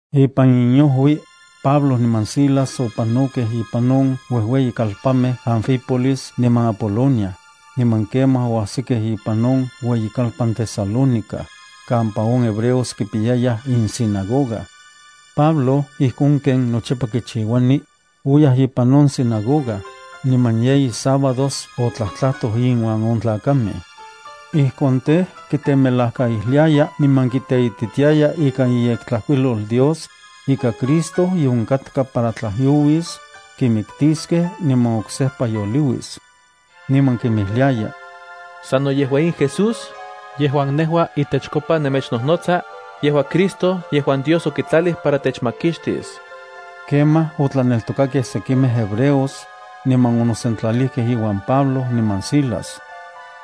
Ipan inojui, Pablo niman Silas opanokej ipan on uejueyikalpanmej Anfípolis niman Apolonia, niman kemaj oajsikej ipan on ueyikalpan Tesalónica, kampa on hebreos kipiyayaj insinagoga. Pablo, ijkon ken nochipa kichiuani, oyaj ipan on sinagoga, niman yeyi sábados otlajtlajtoj inuan on tlakamej. Ijkon tej, kitemelajkaijliaya niman kiteititiaya ikan iyektlajkuilol Dios, ika Cristo ye onkatka para tlajyouis, kimiktiskej, niman oksejpa yoliuis. Niman kinmijliaya: —Sano yejua in Jesús, yejuan nejua itechkopa nemechnojnotsa, yejua Cristo yejuan Dios okitlalij para techmakixtis. Kemaj otlaneltokakej sekimej hebreos, niman onosentlalijkej iuan Pablo niman Silas.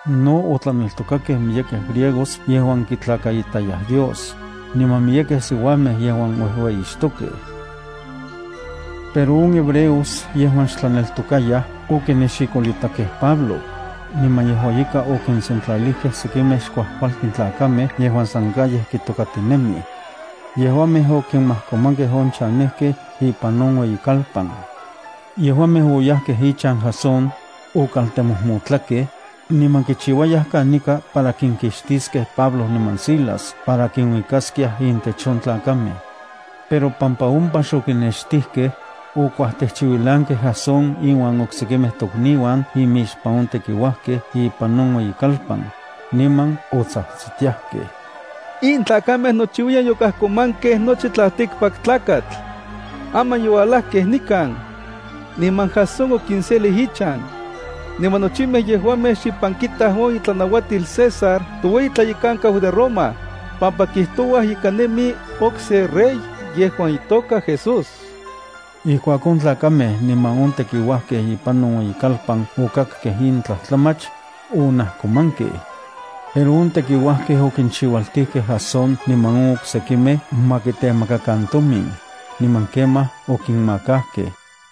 No otlaneltokakej miyekej griegos yejuan kitlakaitayaj Dios, niman miyekej siuamej yejuan uejueyixtokej. Pero on hebreos yejuan xtlaneltokayaj okinexikolitakej Pablo, niman yejua ika okinsentlalijkej sekimej xkuajkualtin tlakamej yejuan san calles kitokatinemij. Yejuamej okimajkomankej on chanejkej ipan on ueyikalpan. Yejuamej oyajkej ichan Jasón, okaltemojmotlakej, niman kichiuayaj kanika para kinkixtiskej Pablo niman Silas para kinuikaskiaj intech on tlakamej. Pero pampa ompa xokinnextijkej, okuajtejchiuilankej Jasón inuan oksekimej tokniuan imixpan on tekiuajkej ipan on ueyikalpan, niman otsajtsitiajkej: —In tlakamej nochiuiyan yokajkomankej nochi tlaltikpaktlakatl. Aman youalajkej nikan, niman Jasón okinselij ichan. Niman nochimej yejuamej xipan kitaj on itlanauatil César toueyi tlayekankau de Roma, pampa kijtouaj ika nemi oksen rey yejuan itoka Jesús. Ijkuak on tlakamej niman on tekiuajkej ipan on ueyikalpan okakkej in tlajtlamach, onajkomankej. Pero on tekiuajkej okinchiualtijkej Jasón niman on oksekimej ma kitemakan tomin, niman kemaj okinmakakej.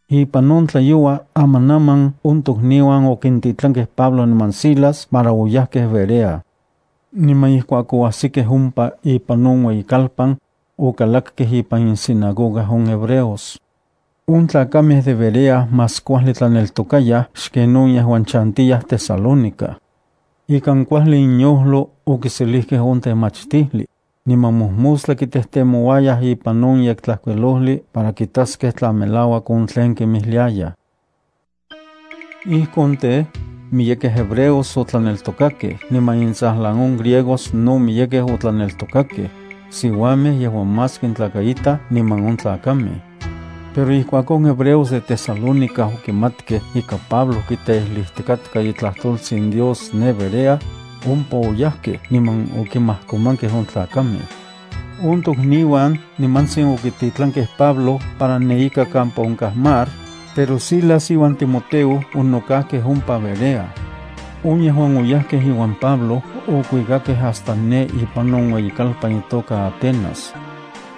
Ipan on tlayoua amanaman on tokniuan okintitlankej Pablo niman Silas para oyajkej Berea. Niman ijkuak oajsikej ompa ipan on ueyikalpan, okalakkej ipan insinagoga on hebreos. On tlakamej de Berea más kuajli tlaneltokayaj xken on yejuan chantiyaj Tesalónica. Ikan kuajli inyojlo okiselijkej on temachtijli, niman mojmostla kitejtemouayaj ipan on Yektlajkuilojli para kitaskej tla melauak on tlen kinmijliayaj. Ijkon tej, miyekej hebreos otlaneltokakej niman intsajlan on griegos no miyekej otlaneltokakej, siuamej yejuan más kintlakaitaj niman on tlakamej. Pero ijkuak on hebreos de Tesalónica okimatkej ika Pablo kiteijlijtikatka itlajtoltsin Dios ne Berea, ompa oyajkej niman okimajkomankej on tlakamej. On tokniuan nimantsin okititlankej Pablo para ne ika kampa onkaj mar, pero Silas iuan Timoteo onokajkej ompa Berea. On yejuan oyajkej iuan Pablo okuikakej hasta ne ipan on ueyikalpan itoka Atenas.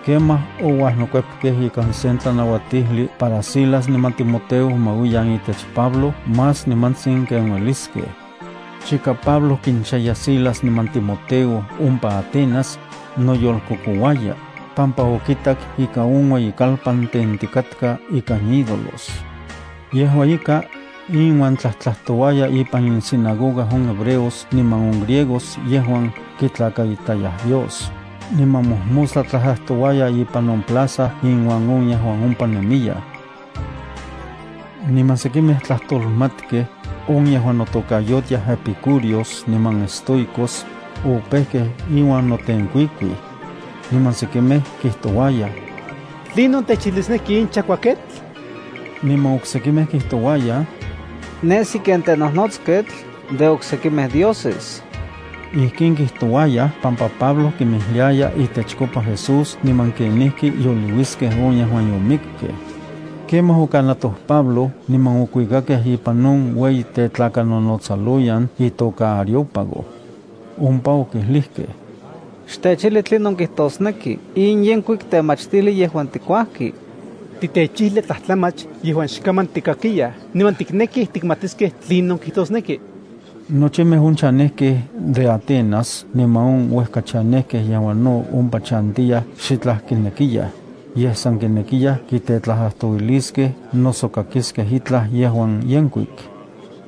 Kemaj ouajnokuepkej ikan sen tlanauatijli para Silas niman Timoteo ma uiyan itech Pablo más nimantsin ken ueliskej. Chika Pablo kinchaya Silas niman Timoteo ompa Atenas, noyolkokouaya, pampa okitak ika on ueyikalpan tentikatka ikan ídolos. Yejua ika, inuan tlajtlajtouaya ipan insinagoga on hebreos niman on griegos yejuan kitlakaitayaj Dios, niman mojmostla tlajtlajtouaya ipan on plaza inuan on yejuan ompa nemiyaj. Niman sekimej tlajtolmatkej, on yejuan notokayotiaj epicúreos niman estoicos, opejkej iuan notenkuikuij. Niman sekimej kijtouayaj: —¿Tlinon techijlisneki in chakuaketl? Niman oksekimej kijtouayaj: —Nesi ken tenojnotsketl de oksekimej dioses. Ijkin kijtouayaj pampa Pablo kinmijliaya itechkopa Jesús niman kenijki yoliuiskej on yejuan yomikkej. Kemaj okanatoj Pablo niman okuikakej ipan on ueyi tetlakanonotsaloyan itoka Areópago. Ompa okijlijkej: —Xtechijli tlinon kijtosneki in yenkuik temachtijli yejuan tikuajki. Titechijlia tlajtlamach yejuan xkaman tikakiyaj niman tiknekij tikmatiskej tlinon kijtosneki.” (Nochimej on chanejkej de Atenas niman on uejka chanejkej yejuan no ompa chantiyaj xitlaj kinekiyaj, yej san kinekiyaj kitetlajtlajtouiliskej noso kakiskej itlaj yejuan yenkuik.)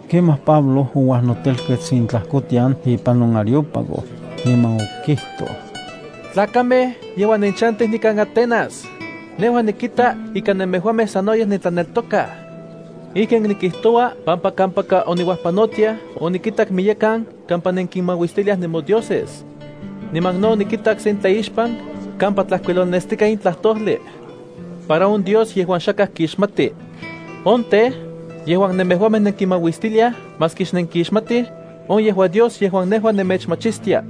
Kemaj Pablo ouajnotelkets intlajkotian ipan on Areópago, niman okijtoj: —Tlakamej yejuan nenchantij nikan Atenas, nejua nikita ika nemejuamej sanoyej nentlaneltokaj. Ijkin nikijtoua pampa kampaka oniuajpanotiaj onikitak miyekan kampa nenkinmauistiliaj nemodioses. Niman no onikitak sen tlaixpan kampa tlajkuilolnestikaj in tlajtojli: “Para on Dios yejuan xakaj kixmati.” On tej, yejuan nemejuamej nenkimauistiliaj maski xnenkixmatij, on yejua Dios yejuan nejua nemechmachistia.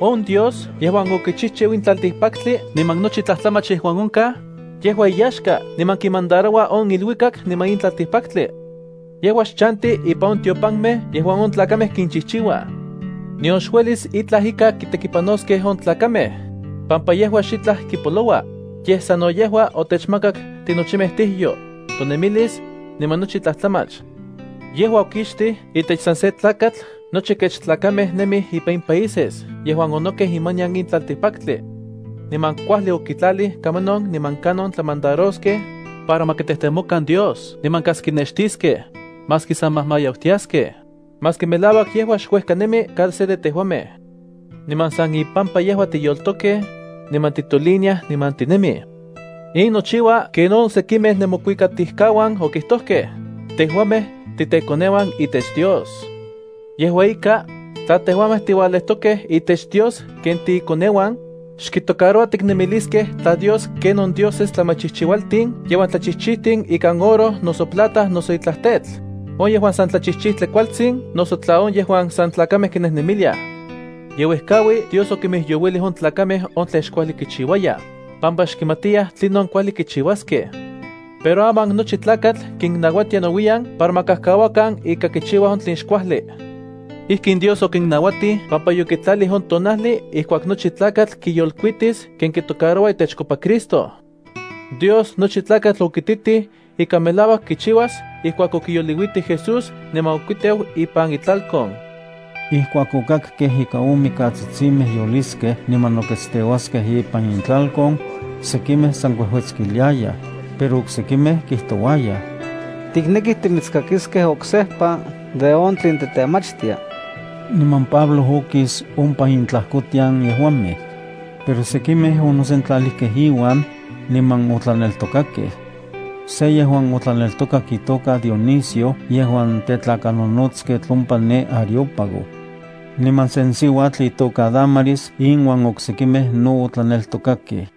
’On Dios yejuan okichijchiu in tlaltikpaktli niman nochi tlajtlamach yejuan onkaj, yejua iyaxka niman kimandaroua on iluikak niman in tlaltikpaktli. Yejua xchanti ipan on tiopanmej yejuan on tlakamej kinchijchiuaj. Nion xuelis itlaj ika kitekipanoskej on tlakamej, pampa yejua xitlaj kipoloua, yej sano yejua otechmakak tinochimej tijyo, tonemilis, niman nochi tlajtlamach. ’Yejua okixtij itech san se tlakatl nochi kech tlakamej nemij ipan in países yejuan onokej imanian in tlaltikpaktli. Niman kuajli okitlalij kamanon niman kanon tlamandaroskej, para ma kitejtemokan Dios niman kas kinextiskej, maski sa majmayautiaskej, maski melauak yejua xuejka nemi cada se de tejuamej. Niman san ipampa yejua tiyoltokej, niman titoliniaj niman tinemij. In nochiua ken on sekimej nemokuikatijkauan okijtojkej: “Tejuamej titekoneuan itech Dios.” Yejua ika, tla tejuamej tiualejtokej itech Dios ken tiikoneuan, xkitocaroua tiknemiliskej tla Dios ken on dioses tlamachijchijualtin yejuan tlachijchijtin ikan oro, noso plata noso itlaj tetl, on yejuan san tlachijchijtli kualtsin noso tla on yejuan san tlakamej kinejnemiliaj. Yeuejkaui Dios okimijyouilij on tlakamej on tlen xkuajli kichiuayaj, pampa xkimatiyaj tlinon kuajli kichiuaskej. Pero aman nochi tlakatl kinnauatia nouiyan para ma kajkauakan ika kichiuaj on tlen xkuajli. Ijkin Dios okinnauatij pampa yokitlalij on tonajli ijkuak nochi tlakatl kiyolkuitis ken kitocaroua itechkopa Cristo. Dios nochi tlakatl okititij ika melauak kichiuas ijkuak okiyoliuitij Jesús niman okuiteu ipan itlalkon. Ijkuak okakkej ika on mikatsitsimej yoliskej niman nokuiteuaskej ipan intlalkon, sekimej san kuejuetskiliayaj, pero oksekimej kijtouayaj: —Tiknekij timitskakiskej oksejpa de on tlen titemachtia. Niman Pablo okis ompa intlajkotian yejuamej. Pero sekimej onosentlalijkej iuan, niman otlaneltokakej. Se yejuan otlaneltokak itoka Dionisio yejuan tetlakanonotsketl ompa ne Areópago. Niman sen siuatl itoka Dámaris inuan oksekimej no otlaneltokakej.